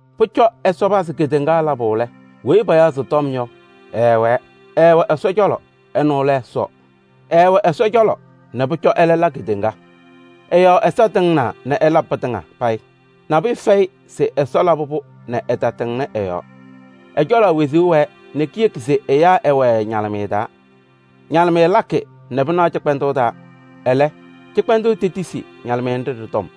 Pʋcɔ Ɛsɔ pazɩ kedeŋa labʋ lɛ, weyi payaɣ se Tɔm yɔ, ɛɛwɛɛ. Ɛɛwɛ Ɛsɔ cɔlɔ, ɛnʋ lɛ Ɛsɔ. Ɛɛwɛ Ɛsɔ cɔlɔ nɛ pʋcɔ ɛlɛ la kedeŋa. Ɛ-yɔɔ Ɛsɔ tɩŋnaa nɛ ɛla pɩtɩŋa payɩ. Nabʋyʋ fɛyɩ se Ɛsɔ labɩ-pʋ nɛ ɛtatɩŋnɩ ɛ-yɔɔ. Ɛ-cɔlɔ wezuu wɛɛ nɛ kiyeki se ɛyaa ɛwɛɛ ñalɩmɩyɛ taa. Ñalɩmɩyɛ ñalɩɣ cɩkpɛndʋʋ taa, ɛlɛ, cɩkpɛndʋʋ tohuuzi ñalɩmɩyɛ nɖɩ ɖɩ-yɔɔ kaʋ.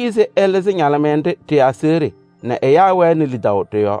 Etiyi-i se ɛlɩzɩ ñalɩmɩyɛ nɖɩ ɖɩ-aseɣɖe nɛ ɛyaa wɛnɩ lidaʋ ɖɩ-yɔɔ.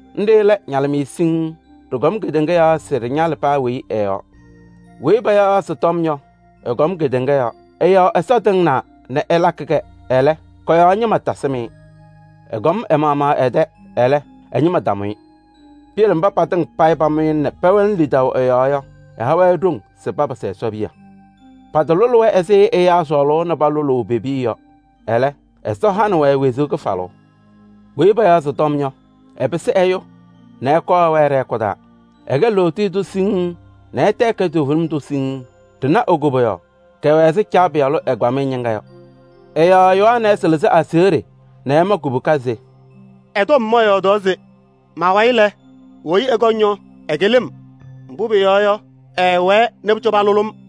Nɖɩ lɛ ñalɩmɩyɛ siŋŋ, ɖɩkɔm kedeŋa yɔɔ se ɖɩñalɩ paa weyi ɛ-yɔɔ. Weyi payaɣ se Tɔm yɔ, ɛkɔm kedeŋa yɔɔ. Ɛ-yɔɔ Ɛsɔ tɩŋnaa nɛ ɛlabɩ-kɛ. Ɛlɛ, kɔ-yɔɔ ñɩma tasɩm-ɩ. Ɛkɔm ɛ-maɣmaɣ ɛ-tɛ, ɛlɛ, ɛ-ñɩma tamʋ-ɩ. Piyele mba patɩŋa payɩ pamʋ-ɩ nɛ pɛwɛnɩ lidaʋ ɛ-yɔɔ yɔ, ɛha-wɛ ɖoŋ se papɩsɩ Ɛsɔ piya. Patalʋlɩ-wɛ ɛzɩ ɛyaa sɔɔlʋʋ nɛ palʋlʋʋ pe-piya yɔ. Ɛlɛ, Ɛsɔ hanɩ-wɛ wezuu kɩfalʋʋ. Weyi payaɣ se Tɔm yɔ, ɛpɩsɩ ɛyʋ nɛ ɛkɔɔ ɛwɛɛ ɖɛ-hɛkʋ taa. Ɛkɛ lootiye tʋ siŋŋ nɛ ɛtɛ ɛkɛ toovenim tʋ siŋŋ. Ɖɩna e-koboyaɣ, kɛwɛ ɛzɩ Caa Pɩyalʋ ɛgbamɩyɛ ñɩŋga yɔ. Ɛ-yɔɔ Yohanɛɛsɩ lɩzɩ aseɣɖe nɛ ɛma kubuka se: “Ɛ-tɔm mɔyɔɔdaɣ se: ‘Ma-wayɩ lɛ, weyi ɛkɔŋ yɔ, ɛkɩlɩ-m, mbʋ pʋyɔɔ yɔ, ɛɛwɛɛ nɛ pʋcɔ palʋlɩ-m.’”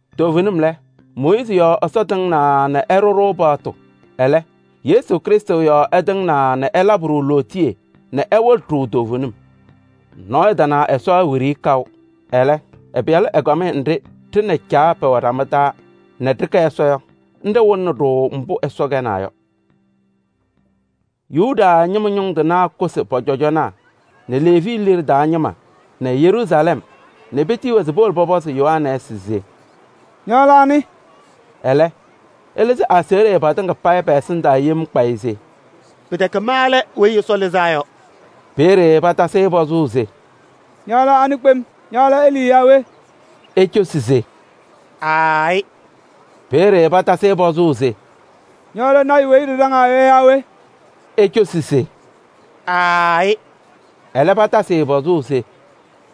Toovenim lɛ, Mooyiizi yɔɔ Ɛsɔ tɩŋnaa nɛ ɛɖʋ-ɖʋ paɣtʋ. Ɛlɛ, Yesu Krɩstʋ yɔɔ ɛtɩŋnaa nɛ ɛlabɩ-ɖʋ lootiye nɛ ɛwɩlɩ-ɖʋ toovenim. Nɔɔyʋ tana Ɛsɔ wiɖiyi kaʋ. Ɛlɛ, ɛ-Pɩyalʋ ɛgbamɩyɛ nɖɩ ɖɩ nɛ Caa pɛwɛ ɖama taa nɛ ɖɩkɛ Ɛsɔ yɔ, nɖɩ wɩlɩnɩ-ɖʋ mbʋ Ɛsɔ kɛnaa yɔ. Yuda ñɩma ñʋŋ tɩnaa kʋsɩ pɔ-cɔjɔnaa nɛ Leevi liɖe taa ñɩma nɛ Yeruusalɛm nɛ petiyi-wɛ se powolo pɔpɔzɩ Yohanɛɛsɩ se: “Ña lɛ anɩ?” Ɛlɛ, ɛlɩzɩ aseɣɖe patɩŋa pɛ-ɛsɩndaa yem kpayɩ se: “Pɩtɛkɛ ma lɛ Weyi Ɛsɔ Lɩzaa Yɔ.” Peeye patasɩ-ɩ pɔzʋʋ se: “Ña lɛ anɩ kpem? Ña lɛ Elii yaa we?” Ecosi se: “Aayɩ.” Peeye patasɩ-ɩ pɔzʋʋ se: “Ña lɛ lɔɔyaɣ tʋ weyi ɖɩɖaŋaa yɔ yaa we?” Ecosi se: “Aayɩ.” Ɛlɛ patasɩ-ɩ pɔzʋʋ se: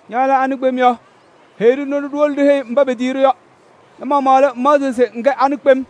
“Ña lɛ anɩ kpem yɔ? Heyi-ɖʋ nɛ ɖiwolo ɖiheyi mba petiyi-ɖʋ yɔ. Ña-maɣmaɣ lɛ, ŋmaɣzɩɣ se ŋkɛ we kpem?”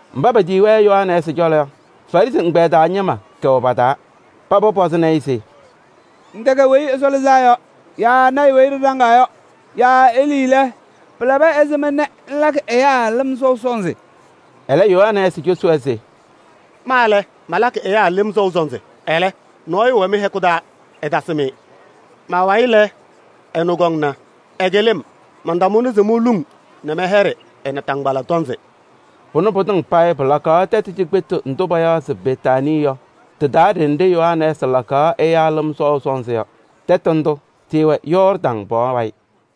Mba petiyi-wɛ Yohanɛɛsɩ cɔlɔ yɔ, Farɩsɩ ɛgbɛyɛ taa ñɩma kɛwɛ pa-taa. Paba pɔzɩnɩ-ɩ se: “Ŋtɛkɛ Weyi Ɛsɔ Lɩzaa Yɔ yaa lɔɔyaɣ tʋ weyi ɖɩɖaŋaa yɔ yaa Elii lɛ, pɩlabɩ ɛzɩma nɛ ŋlakɩ ɛyaa lɩm sɔʋ sɔnzɩ?” Ɛlɛ Yohanɛɛsɩ cosi-wɛ se: “Ma lɛ, malakɩ ɛyaa lɩm sɔʋ sɔnzɩ. Ɛlɛ, nɔɔyʋ wɛ mɩ-hɛkʋ taa, ɩtasɩm-ɩ. Ma-wayɩ lɛ, ɛnʋ kɔŋna. Ɛkɩlɩ-m, mantamʋnɩ se moluŋ nɛ mɛyɛɖɩ ɛ-naataŋgbala tɔnzɩ.” Pʋnɛ pɩtɩŋa payɩ pɩlakaɣ tɛtʋ cikpetu ndʋ payaɣ se Betaanii yɔ, tɩ-taa ɖenɖe Yohanɛɛsɩ lakaɣ ɛyaa lɩm sɔʋ sɔnzɩ yɔ. Tɩɩwɛ Yɔɔrdaŋ pɔɔ wayɩ.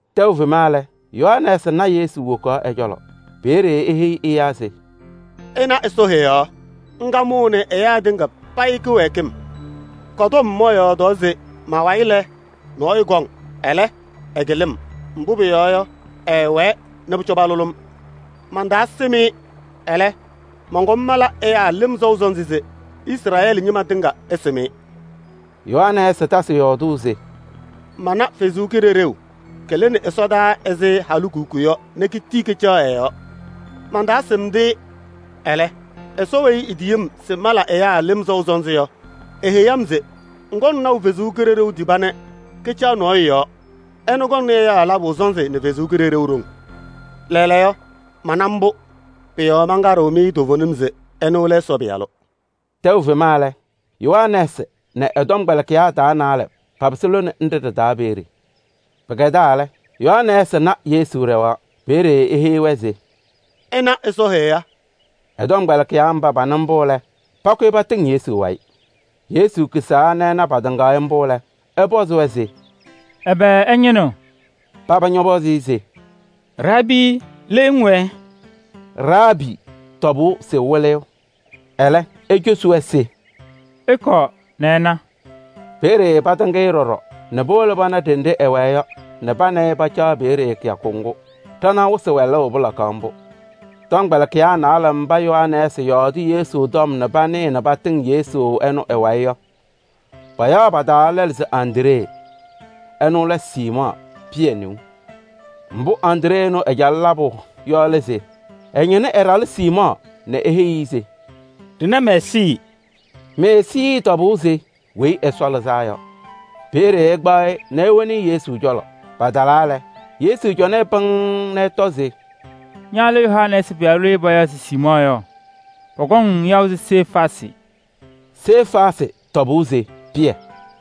Tɛʋ fema lɛ, Yohanɛɛsɩ na Yesu wokaɣ ɛ-cɔlɔ. Peeye eheyi ɛyaa se: “Ɩnaɣ Ɛsɔ Heɣa, ŋga mʋʋnɩ ɛyaa tɩŋa payɩ kɩwɛɛkɩm. Kɔ-tɔm mɔyɔɔdaɣ se ma-wayɩ lɛ, nɔɔyʋ kɔŋ. Ɛlɛ, ɛkɩlɩ-m, mbʋ pʋyɔɔ yɔ, ɛɛwɛɛ nɛ pʋcɔ palʋlɩ-m. Mantaasɩm-ɩ. Ɛlɛ, mɔnkɔm mala ɛyaa lɩm sɔʋ sɔnzɩ se Izrɛɛlɩ ñɩma tɩŋa ɛsɩm-ɩ.” Yohanɛɛsɩ tasɩ yɔɔdʋʋ se: “Mana Ɛsɔ Kalɩzaɣ lɩnɩ ɛsɔdaa ɛzɩ halikuku yɔ nɛ ketii kacaɣ ɛ-yɔɔ. Mantaasɩmdɩ-ɩ. Ɛlɛ, Ɛsɔ weyi etiyi-m se mala ɛyaa lɩm sɔʋ sɔnzɩ yɔ, eheyi-m se: ‘Ŋkɔŋ naʋ Ɛsɔ Kalɩzaɣ tiba nɛ kacaɣ nɔɔyʋ yɔɔ. Ɛnʋ kɔŋnɩ ɛyaa labʋ sɔnzɩ nɛ Ɛsɔ Kalɩzaɣ haʋ.’ Lɛɛlɛɛyɔ mana mbʋ, pʋ-yɔɔ mankaɖɩɣ-mɩ toovenim se ɛnʋ lɛ Ɛsɔ Pɩyalʋ.” Tɛʋ fema lɛ, Yohanɛɛsɩ nɛ ɛ-tɔmkpɛlɩkɩyaa taa naalɛ papɩsɩ lone nɖɩ ɖɩ-taa peeye. Pɩkɛdaa lɛ, Yohanɛɛsɩ na Yesu ɖɛɣaɣ. Peeye eheyi-wɛ se: “Ɩna Ɛsɔ Heɣa.” Ɛ-tɔmkpɛlɩkɩyaa mba panɩ mbʋ lɛ, pakʋyɩ patɩŋ Yesu wayɩ. Yesu kisaa nɛ ɛna patɩŋaɣ-ɩ mbʋ lɛ, ɛpɔzɩ-wɛ se: “Ɛbɛ ɩñɩnɩɣ?” Paba ñɔpɔzɩ-ɩ se: “Raabii! Le ŋwɛɛ?” Raabii tɔbʋʋ se Wɩlɩyʋ. Ɛlɛ ecosi-wɛ se: “Ɩkɔɔ nɛ ɩna.” Peeye patɩŋ-ɩ ɖɔɖɔ nɛ powolo pana ɖenɖe ɛwɛɛ yɔ nɛ pa nɛ ɩ pacaɣ peeye kɩyakʋ ŋgʋ. Ɖanaɣ wɩsɩ wɛlʋʋ pɩlakaɣ mbʋ. Tɔmkpɛlɩkɩyaa naalɛ mba Yohanɛɛsɩ yɔɔdɩ Yesu tɔm nɛ panɩɩ nɛ patɩŋ Yesu ɛnʋ ɛ-wayɩ yɔ, payaɣ pa-taa lɛlʋ se Andree. Ɛnʋ lɛ Siimɔɔ Pɩyɛ neu. Mbʋ Andree ɛnʋ ɛcalɩ labʋ yɔ lɛ se: ɛñɩnɩ ɛ-ɖalʋ Siimɔɔ nɛ eheyi-i se: “Ɖɩna Meesii.” Meesii tɔbʋʋ se Weyi Ɛsɔ Lɩzaa Yɔ. Peeye ɛkpaɣ-ɩ nɛ ewoni-i Yesu cɔlɔ. Patalaa lɛ, Yesu cɔnɩ-ɩ pɩŋŋ nɛ ɛtɔ se: “Ña lɛ Yohanɛɛsɩ pɩyalʋ weyi payaɣ se Siimɔɔ yɔ, pɔkɔŋ-ŋ yaʋ se Sefaasɩ.” Sefaasɩ tɔbʋʋ se Pɩyɛ.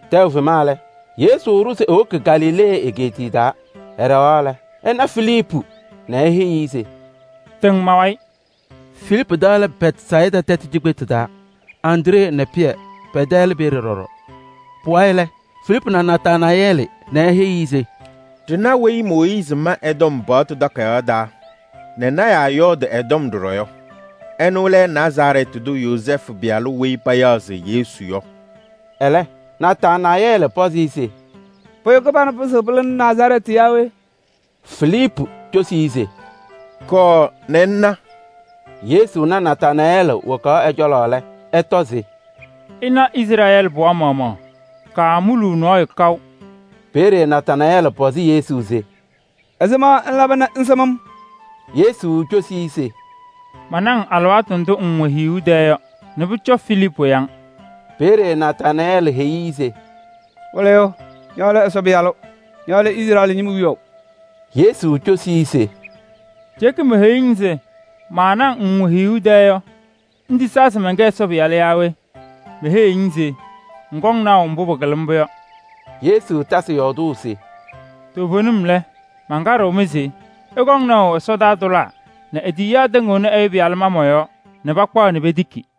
Tɛʋ fema lɛ, Yesu ɖʋ se ewoki Galilee egeetiye taa. Ɛɖɛɣaɣ lɛ, ɛna Filiipu nɛ eheyi-i se: “Tɩŋ ma-wayɩ.” Filiipu tɛ lɛ Bɛtsayɩda tɛtʋ cikpetu taa. Andree nɛ Pɩyɛ pɛ-tɛ lɛ peeye ɖɔɖɔ. Pʋwayɩ lɛ, Filiipu na Nataanayɛɛlɩ nɛ eheyi-i se: “Ɖɩna weyi ɛ-tɔm Mooyiizi ma paɣtʋ takayaɣ taa nɛ lɔɔyɩsɩ tɩnaa yɔɔdɩ ɛ-tɔm yɔ. Ɛnʋ lɛ Nazarɛɛtɩ tʋ Yozɛɛfʋ pɩyalʋ weyi payaɣ se Yesu yɔ.” Ɛlɛ, Nataanayɛɛlɩ pɔzɩ-ɩ se: “Pʋyʋ kɩbanʋ pɩzɩɣ pɩlɩnɩ Nazarɛɛtɩ yaa we?” Filiipu cosi-i se: “Kɔɔ nɛ ŋna.” Yesu na Nataanayɛɛlɩ wokaɣ ɛ-cɔlɔ lɛ, ɛtɔ se: “Ɩna Izrɛɛlɩ pɩɣa maɣmaɣ. Kaamuluu nɔɔyʋ kaʋ.” Peeye Nataanayɛɛlɩ pɔzɩ Yesu se: “Ɛzɩma ŋlaba nɛ ŋsɩm-m?” Yesu cosi-i se: “Mana-ŋ alɩwaatʋ ndʋ ŋwɛ hiyuu tɛɛ yɔ nɛ pʋcɔ Filiipu ya-ŋ.” Peeye Nataanayɛɛlɩ heyi-i se: “Wɩlɩyʋ! Ña lɛ Ɛsɔ Pɩyalʋ. Ña lɛ Izrɛɛlɩ ñɩma wiyaʋ.” Yesu cosi-i se: “Ceeke meheyuu-ŋ se mana-ŋ hiyuu tɛɛ yɔ ŋtisaa se ma lɛ Ɛsɔ Pɩyalʋ? Meheyiɣ-ŋ se ŋkɔŋ naʋ mbʋ pɩkɩlɩ mbʋ yɔ.” Yesu tasɩ yɔɔdʋʋ se: “Toovenim lɛ, mankaɖɩɣ-mɩ se ɩkɔŋ naʋ ɛsɔtɔnʋʋ tʋlaa nɛ e-tiyiyaa tɩŋɩɣnɩ Ɛyʋ Pɩyalʋ ma mɔ-yɔɔ nɛ pakpaɣ nɛ petiki.”